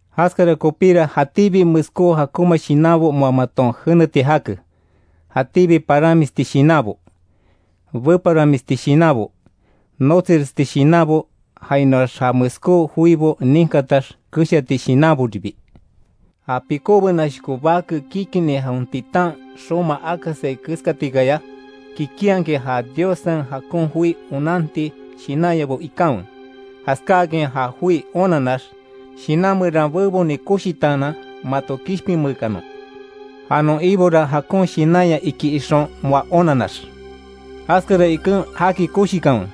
Jaskara kopíra jatíbi meskó jakonma shinanbo moa maton jeneti jake: jatíbi paranmisti shinanbo; beparanmisti shinanbo, notsiresti shinanbo jainoax ja meskó joibo ninkatax keshati shinanboribi. Ja pikó benashoko bake kikini jawen titan xoma akasai keskatikaya, kikinhakin ja Diossen jakon joi onanti shinanyabo ikanwe, jaskáakin ja joi onanax, shinan meran beboni koshitaanan mato kishpinmeekanon. Ja non Ibora jakon shinanya iki ixon moa onanax. Jaskara iken jaki koshikanwe,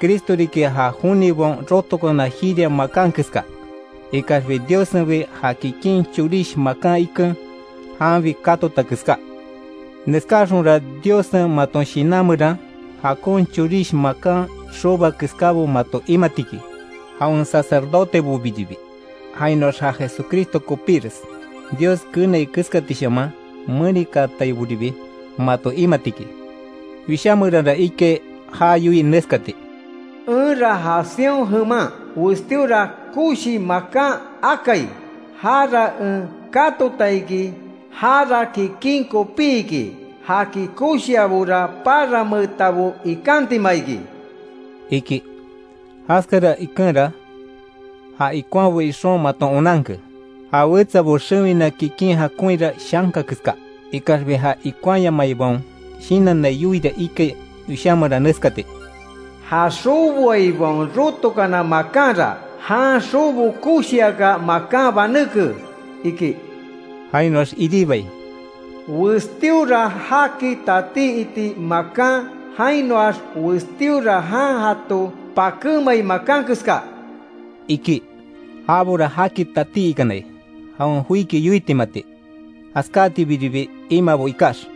Cristo riki ja jonibaon rotokana jiria makan keska, ikaxbi Diossenbi ja kikin chorish makan iken, janbi katota keská. Neskáxonra Diossen maton shinan meran, jakon chorish makan xoboa keskábo mato imati iki, jawen sacerdotebobiribi, jainoax ja Jesucristo kopíres, Dios keenai keskatishaman menikaataiboribi mato imati iki. Wishá meranra ikai já yoii neskati: “Enra ja Sión jeman westíora koshi makan akai, jara en katota iki, jara kikin kopí iki, jaki koshiabora, paranmeetabo ikantima iki”, iki. Jaskara ikenra ja ikonhabo ixon maton onanke, ja wetsabo xewina kikin jakonhira shanka keska, ikaxbi ja ikonhayamaibaon shinannai yoiira ikai Wishá meran neskati: “Ja xoboaibaon rotokana makanra, jan xobo koshiaka makan banéke”, iki. Jainoax iribai: “Westíora jaki tatí iti makan, jainoax westíora jan jato pakémai makan keska”, iki. Jabora jaki tatí ikanai, jawen joiki yoitimati; jaskátibiribi imaabo ikax.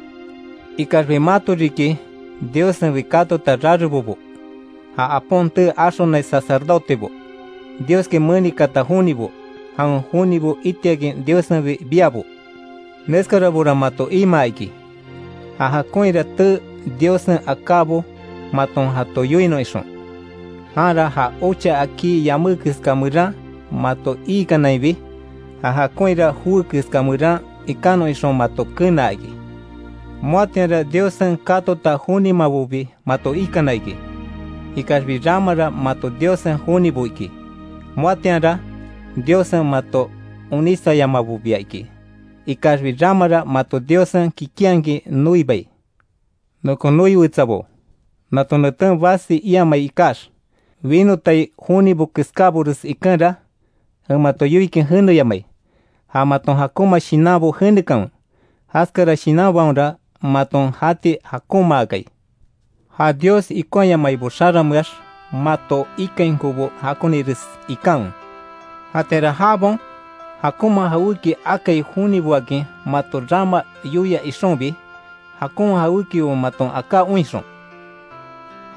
Ikaxbi mato riki, Diossenbi katota rarebobo, ja Apon tee axonai sacerdotebo, Dioski menikaata jonibo, jawen jonibo itiakin Diossenbi biabo. Neskarabora mato imaa iki, ja jakonhira tee Diossen akábo maton jato yoinon ixon. Janra ja ocha akí yamé keska meran mato iikanainbi, ja jakonhira joé keska meran ikanon ixon mato kenaa iki. Moatianra Diossen katota jonimabobi mato ikana iki, ikaxbi ramara mato Diossen jonibo iki, moatianra Diossen mato onísayamabobia iki, ikaxbi ramara mato Diossen kikinhakin noibai. Nokon noi wetsabo nato neten basi iamai ikax, winotai jonibo keskábores ikenra, en mato yoikin jeneyamai; ja maton jakonma shinanbo jenekanwe, jaskara shinanbaonra maton jati jakonmaakai. Ja Dios ikonhayamaibo xarameax mato ikainkobo jakonires ikanwe. Jatianra jabaon, jakonma jawéki akai joniboakin mato rama yoia ixonbi, jakon jawékibo maton aká oinxon,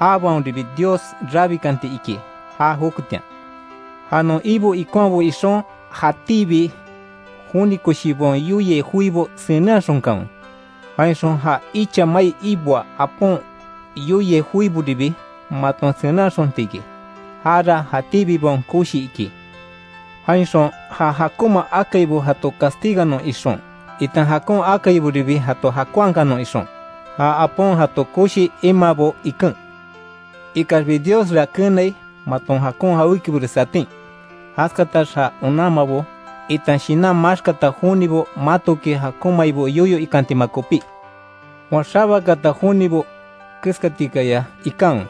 jabaonribi Dios rabikanti iki já joketian. Ja non Ibo ikonhabo ixon jatíbi joni koshibaon yoiai joibo senenhaxonkanwe, jainxon ja icha mai iboaa apon yoiai joiboribi maton senenhaxonti iki, jara jatíbibaon koshi iki. Jainxon ja jakonma akaibo jato castiganon ixon itan jakon akaiboribi jato jakonhakanon ixon, ja apon jato koshi imaabo iken. Ikaxbi Diosra keenai maton jakon jawékibores atin, jaskatax ja onanmabo, itan shinan maxkata jonibo matoki jakonmaibo yoyo ikantima kopí. Moa xabakaata jonibo keskatikaya ikanwe.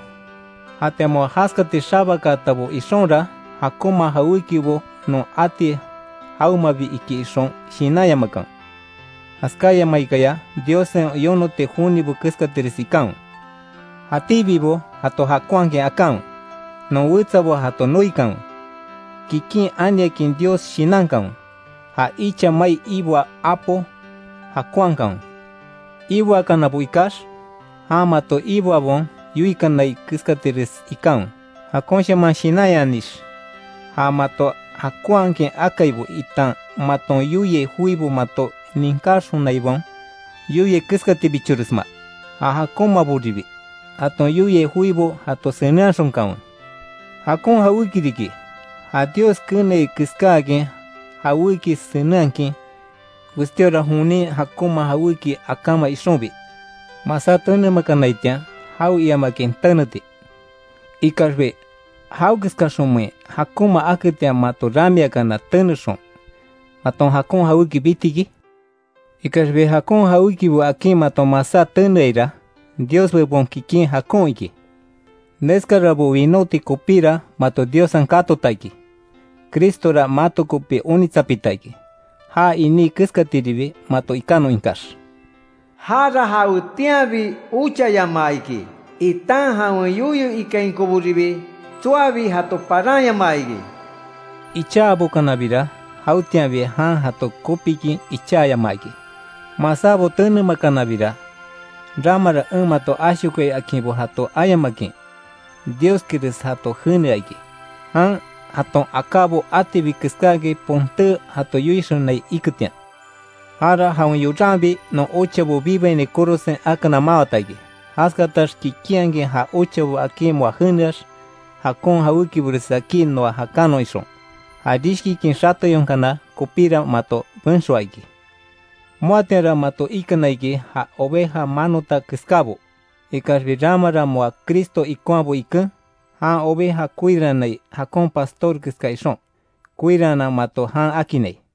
Jatian moa jaskati xabakaatabo ixonra, jakonma jawékibo non ati jawemabi iki ixon shinanyamakanwe. Jaskáyamaikaya Diossen yonoti jonibo keskatires ikanwe. Jatíbibo jato jakonhakin akanwe, non wetsabo jato noikanwe, kikin aniakin Dios shinankanwe, ja icha mai iboaa apo jakonhakanwe. Iboakanabo ikax, jan mato iboabaon yoikanai keskatires ikanwe, jakonshaman shinanyanix; ja mato jakonhakin akaibo, itan maton yoiai joibo mato ninkáxonaibaon yoiai keskatibichoresma, ja jakonmaboribi jaton yoiai joibo jato senenhaxonkanwe. Jakon jawéki riki, ja Dios keenai keskáakin jawéki senenhakin, westíora jonin jakonma jawéki akáma ixonbi, masá tenemakanaitian, jawe iamakin teneti. Ikaxbi ¿Jawekeskaxonmein jakonma aketian mato ramiakana tenexon, maton jakon jawéki biti iki? Ikaxbi jakon jawékibo akín maton masá teneaira, Dios bebon kikin jakon iki. Neskarabo winóti kopíra mato Diossen katota iki, Cristora mato kopi onitsapita iki, já iní keskatiribi mato ikanon ikax. Jára jawetianbi ochayamaa iki, itan jawen yoyo ikainkoboribi tsoabi jato paranyamaa iki. Ichabokanabira jawetianbi jan jato kopikin icháyamaa iki, masábo tenemakanabira, ramara en mato ashokoai akinbo jato ayamakin, Dioskires jato jenea iki, jan jaton akábo atibi keskáakin ponté jato yoixonai iketian. Jara jawen yoranbi non ochabo bibaini korosen akana mawata iki, jaskatax kikinhakin ja ochabo akin moa jeneax, jakon jawékibores akí noa jakanon ixon. Ja rishkikin xateyonkana kopíra mato benxoa iki. Moatianra mato ikana iki ja oveja manota keskábo, ikaxbi ramara moa Cristo ikonhabo iken, jan oveja koirannai jakon pastor keska ixon, koiraanan mato jan akinnai.